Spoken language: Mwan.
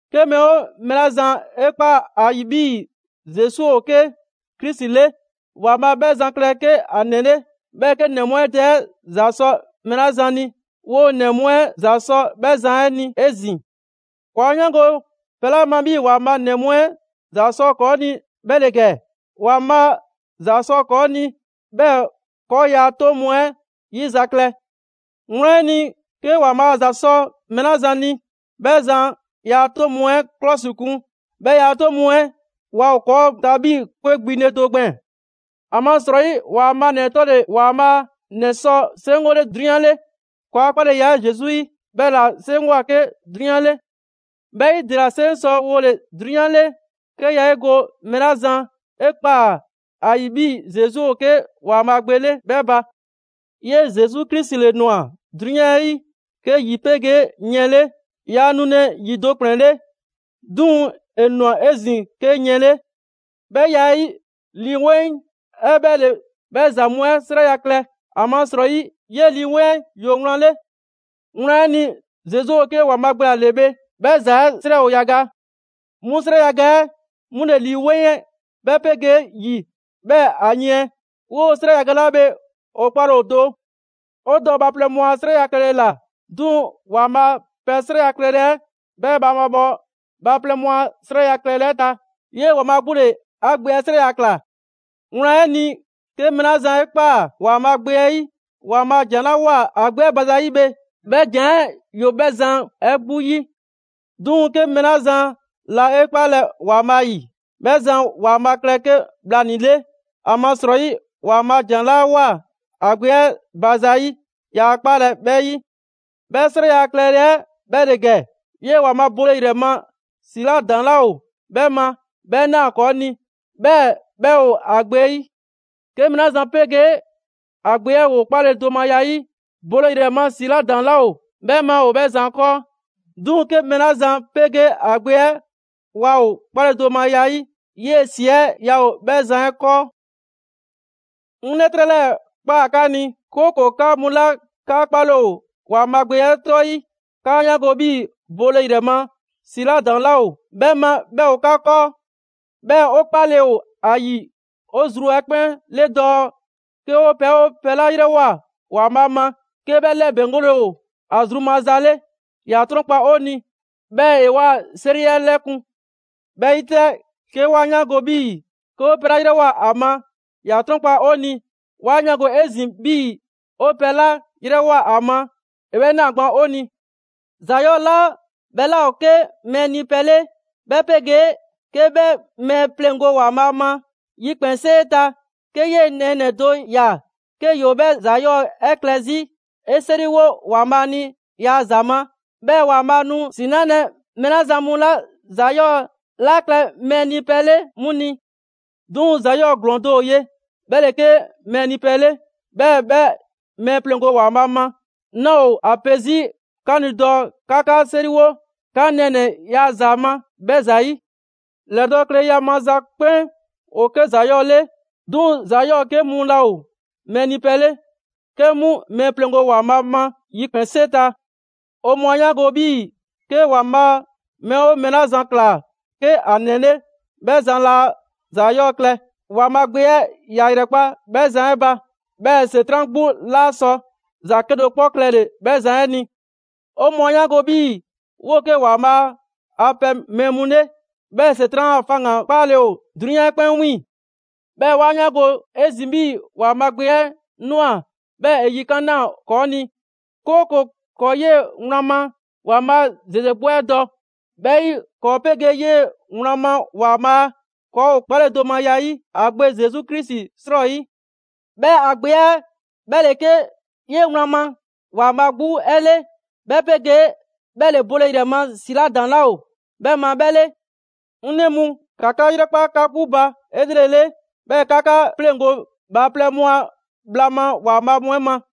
'Ke mɛɛ 'oo mɛɛ 'la zan 'e ꞊kpaa ‑a ‑yi 'bhii‑ Zesu ‑o 'ke Krisi 'le, ‑Waanbhaa' 'bhɛ zan klɛ 'ke ‑a ‑nɛ 'le. 'Bhɛɛ‑ 'ke ‑nɛ mu 'ɛ dɛ 'ɛ ‑za sɔ mɛɛ 'la zan ni, 'woo‑ ‑nɛ mu 'ɛ ‑za sɔ 'bhɛ zan 'ɛ ni 'ezin‑. ‑Kɔɔ' 'a 'yaango‑ pɛ 'la ma 'bhii‑ ‑Waanbhaa' ‑nɛ mu 'ɛ ‑za sɔ ‑kɔɔ' ni, 'bhɛ ‑le ‑gɛ: ‑Waanbhaa' ‑za sɔ ‑kɔɔ' ni, 'bhɛɛ‑ ‑kɔɔ' ‑yaa' 'toŋ mu 'ɛ 'yizaklɛ. Wlan 'ɛ ni, 'ke ‑Waanbhaa' ‑za sɔ mɛɛ 'la zan ni, 'bhɛ zan ‑yaa' 'toŋ mu 'ɛ 'klɔsikun; 'bhɛɛ‑ ‑yaa' 'toŋ mu 'ɛ waa ‑o ‑kɔɔ' ta 'bhii‑ 'kwe kpiŋle do gbɛɛn‑. ‑Amasrɔyi, ‑Waanbhaa' ‑nɛ 'tɔle‑ ‑Waanbhaa' ‑nɛ sɔ 'seŋgole 'drunyan 'le. ‑Kɔɔa' 'kpaleya 'ɛ Zesu 'yi 'bhɛla‑ 'seŋgwa‑ 'ke 'drunyan 'le. 'Bhɛ 'yi, ‑dela 'seŋ sɔ wole‑ 'drunyan 'le, 'ke yaa 'e go mɛɛ 'la zan 'e ꞊kpaa ‑a ‑yi 'bhii‑ Zesu ‑o 'ke ‑Waanbhaa' Gbe 'le 'bhɛ ba. 'Yee‑ Zesu Krisi ‑le ‑nwa 'drunyan 'ɛ 'yi, 'ke ‑yi 'pegee yiɛn 'le. Yaa nulɛ ‑yi do ‑kplɛn 'le, 'duŋ‑ ‑e ꞊nwa 'ezin‑ 'ke yiɛn 'le. 'Bhɛ ya 'ɛ 'yi, Lii 'Weŋ 'ɛ 'bhɛ ‑le 'bhɛ ‑za mu 'ɛ 'srɛya‑ klɛ, ‑amasrɔyi 'yee‑ Lii 'Weŋ 'ɛ ‑yoo wlan 'le. Wlan 'ɛ ni, Zesu ‑o 'ke ‑Waanbhaa' Gbe 'la 'le bhe 'bhɛ ‑za 'ɛ 'srɛ ‑o yaga. 'Mu 'srɛ yaga 'ɛ 'mu ‑le Lii 'Weŋ 'ɛ, 'bhɛ 'pegee ‑yi, 'bhɛɛ‑ ‑a yiɛn. 'Woo‑ 'srɛ yaga 'la bhe ‑o 'kpale‑ ‑o do. 'O dɔ bhaaplɛŋ mu a 'srɛya‑ klɛle ‑la; 'duŋ‑ ‑Waanbhaa' a pɛ 'srɛya‑ klɛle 'ɛ 'bhɛ mabhaabhɔ bhaaplɛŋ mu a 'srɛya‑ klɛle 'ɛ ta. 'Yee‑ ‑Waanbhaa' 'gbu ‑le ‑a Gbe 'ɛ 'srɛya‑ ‑kla. Wlan 'ɛ ni, 'ke mɛɛ 'la zan 'e ꞊kpaa ‑Waanbhaa' Gbe 'ɛ 'yi, ‑Waanbhaa' ‑jan 'la 'woa‑ ‑a Gbe 'ɛ ba zayi' bhe, 'bhɛ ‑jan 'ɛ ‑yoo 'bhɛ zan 'ɛ 'gbu 'yi. 'Duŋ‑ 'ke mɛɛ 'la zan laa 'e 'kpalɛ‑ ‑Waanbhaa' 'yi, 'bhɛ zan ‑Waanbhaa' klɛ 'ke bhlanii‑ 'le. ‑Amasrɔyi, ‑Waanbhaa' ‑jan 'la ꞊woa ‑a Gbe 'ɛ ba zayi', yaa 'kpalɛ‑ 'bhɛ 'yi. 'Bhɛ 'srɛya‑ klɛle 'ɛ 'bhɛ ‑le ‑gɛ: 'yee ‑Waanbhaa' bole ‑yrɛ ma ‑si 'la ‑daŋ' 'laa ‑o 'bhɛ ma 'bhɛ꞊naa ‑kɔɔ' ni, 'bhɛɛ‑ 'bhɛ ‑o ‑a Gbe 'ɛ 'yi. 'Ke mɛɛ 'la zan 'pegee ‑a Gbe 'ɛ ‑woo 'kpaledomaya 'yi, bole ‑yrɛ ma ‑si 'la ‑daŋ' 'laa ‑o 'bhɛ ma ‑o 'bhɛ zan 'kɔɔ. 'Duŋ‑ 'ke mɛɛ 'la zan 'pegee ‑a Gbe 'ɛ waa ‑o 'kpaledomaya 'yi, 'yee‑ ‑si 'ɛ yaa ‑o 'bhɛ zan 'ɛ 'kɔɔ. 'Ŋ 'lɛtrɛ 'lɛɛ‑ ꞊kpaa 'ka ni, 'kooko‑ 'ka mu 'la 'ka 'kpale‑ ‑o ‑Waanbhaa' Gbe 'ɛ 'tɔ 'yi, 'kaa 'yaango‑ 'bhii‑ bole ‑yrɛ ma ‑si 'la ‑daŋ' 'laa ‑o 'bhɛ ma 'bhɛ ‑o 'ka 'kɔɔ. 'Bhɛɛ‑ 'o 'kpale‑ ‑o ‑a ‑yi 'o zru 'ɛ 'kpɛn 'le dɔɔ 'ke 'o pɛ 'oo pɛ 'la 'yrɛwoa‑ ‑Waanbhaa' ma 'ke 'bhɛ 'lɛbɛŋgole ‑o ‑a zru maza 'le, ‑ya 'trɔnkpa 'o ni, 'bhɛɛ‑ ‑e 'waa 'seri 'ɛ 'lɛkun‑. 'Bhɛ 'yi 'tɛ, 'ke 'wa 'yaango‑ 'bhii‑ 'ke 'o pɛ 'la 'yrɛwoa‑ ‑a ma, ‑ya 'trɔnkpa 'o ni; 'wa 'yaango‑ 'ezin‑ 'bhii‑ 'o pɛ 'la 'yrɛwoa‑ ‑a ma, ‑e 'bhɛ ꞊naa gban 'o ni. ‑Za 'yɔɔ‑ 'la 'bhɛ 'laa ‑o 'ke mɛɛ nipɛ 'le, 'bhɛ 'pegee 'ke 'bhɛ mɛɛ pleŋgo ‑Waanbhaa' ma yikpɛnsee ta, 'ke 'yee‑ nɛɛnɛ‑ do ‑ya 'ke ‑yoo 'bhɛ ‑za 'yɔɔ‑ 'ɛ klɛ 'zi, 'e 'seriwo ‑Waanbhaa' ni ‑yaa' ‑za ma. 'Bhɛɛ‑ ‑Waanbhaa' nu ‑si 'nalɛ‑ mɛɛ 'la zan mu laa ‑za 'yɔɔ‑ 'la klɛ mɛɛ nipɛ 'le 'mu ni. 'Duŋ‑ ‑za 'yɔɔ‑ ‑glɔɔn do ‑o ye, 'bhɛ ‑le 'ke mɛɛ nipɛ 'le, 'bhɛɛ‑ 'bhɛ mɛɛ pleŋgo ‑Waanbhaa' ma. 'Naa ‑o ‑a pe 'zi 'ka ni dɔɔ 'ka 'ka 'seriwo 'ka nɛɛnɛ‑ ‑yaa' ‑za ma 'bhɛ ‑zayi'. ‑Lɛdɔɔkleya maza 'kpɛn ‑o 'ke ‑za 'yɔɔ‑ 'le. 'Duŋ‑ ‑za 'yɔɔ‑ 'ke mu laa ‑o mɛɛ nipɛ 'le, 'ke 'mu mɛɛ pleŋgo ‑Waanbhaa' ma yikpɛnsee ta. 'O mɔɔ 'a 'yaango‑ 'bhii‑ 'ke ‑Waanbhaa' mɛɛ 'oo mɛɛ 'la zan ‑kla 'ke ‑a ‑nɛ 'le, 'bhɛ zan laa ‑za 'yɔɔ‑ klɛ. ‑Waanbhaa' Gbe 'ɛ ‑ya ‑yrɛkpa' 'bhɛ zan 'ɛ ba; 'bhɛɛ‑ ‑Setran' 'gbu 'laa sɔ ‑za 'kedo‑ 'kpɔ klɛle‑ 'bhɛ zan 'ɛ ni. 'O mɔɔ 'a 'yaango‑ 'bhii‑ 'woo 'ke ‑Waanbhaa' a pɛ mɛɛ mu 'le, 'bhɛɛ‑ ‑Setran' a faŋgan‑ 'kpaale‑ ‑o 'drunyan 'ɛ 'kpɛn 'wiiŋ‑. 'Bhɛɛ‑ 'wa 'yaango‑ 'ezin‑ 'bhii‑ ‑Waanbhaa' Gbe 'ɛ ꞊nwa, 'bhɛɛ‑ ‑e yikan' ꞊naa ‑kɔɔ' ni, 'kooko‑ ‑kɔɔ' 'yee‑ wlan ma ‑Waanbhaa' ‑zeze 'gbu 'ɛ dɔ. 'Bhɛ 'yi, ‑kɔɔ' 'pegee 'yee‑ wlan ma ‑Waanbhaa' ‑kɔɔ' ‑o 'kpaledomaya 'yi ‑a Gbe Zesu Krisi 'srɔyi. 'Bhɛɛ‑ ‑a Gbe 'ɛ 'bhɛ ‑le 'ke 'yee‑ wlan ma ‑Waanbhaa' 'gbu 'ɛ 'le, 'bhɛ 'pegee 'bhɛ ‑le bole ‑yrɛ ma ‑si 'la ‑daŋ 'laa ‑o 'bhɛ ma 'bhɛ 'le. 'Ŋ 'nɛ mu, ‑ka 'ka 'yrɛkpa 'ka 'gbu ba 'elrele, 'bhɛɛ‑ 'ka 'ka 'pleŋgo bhaaplɛŋ mu a bhla ma ‑waanbhaa' mu 'ɛ ma.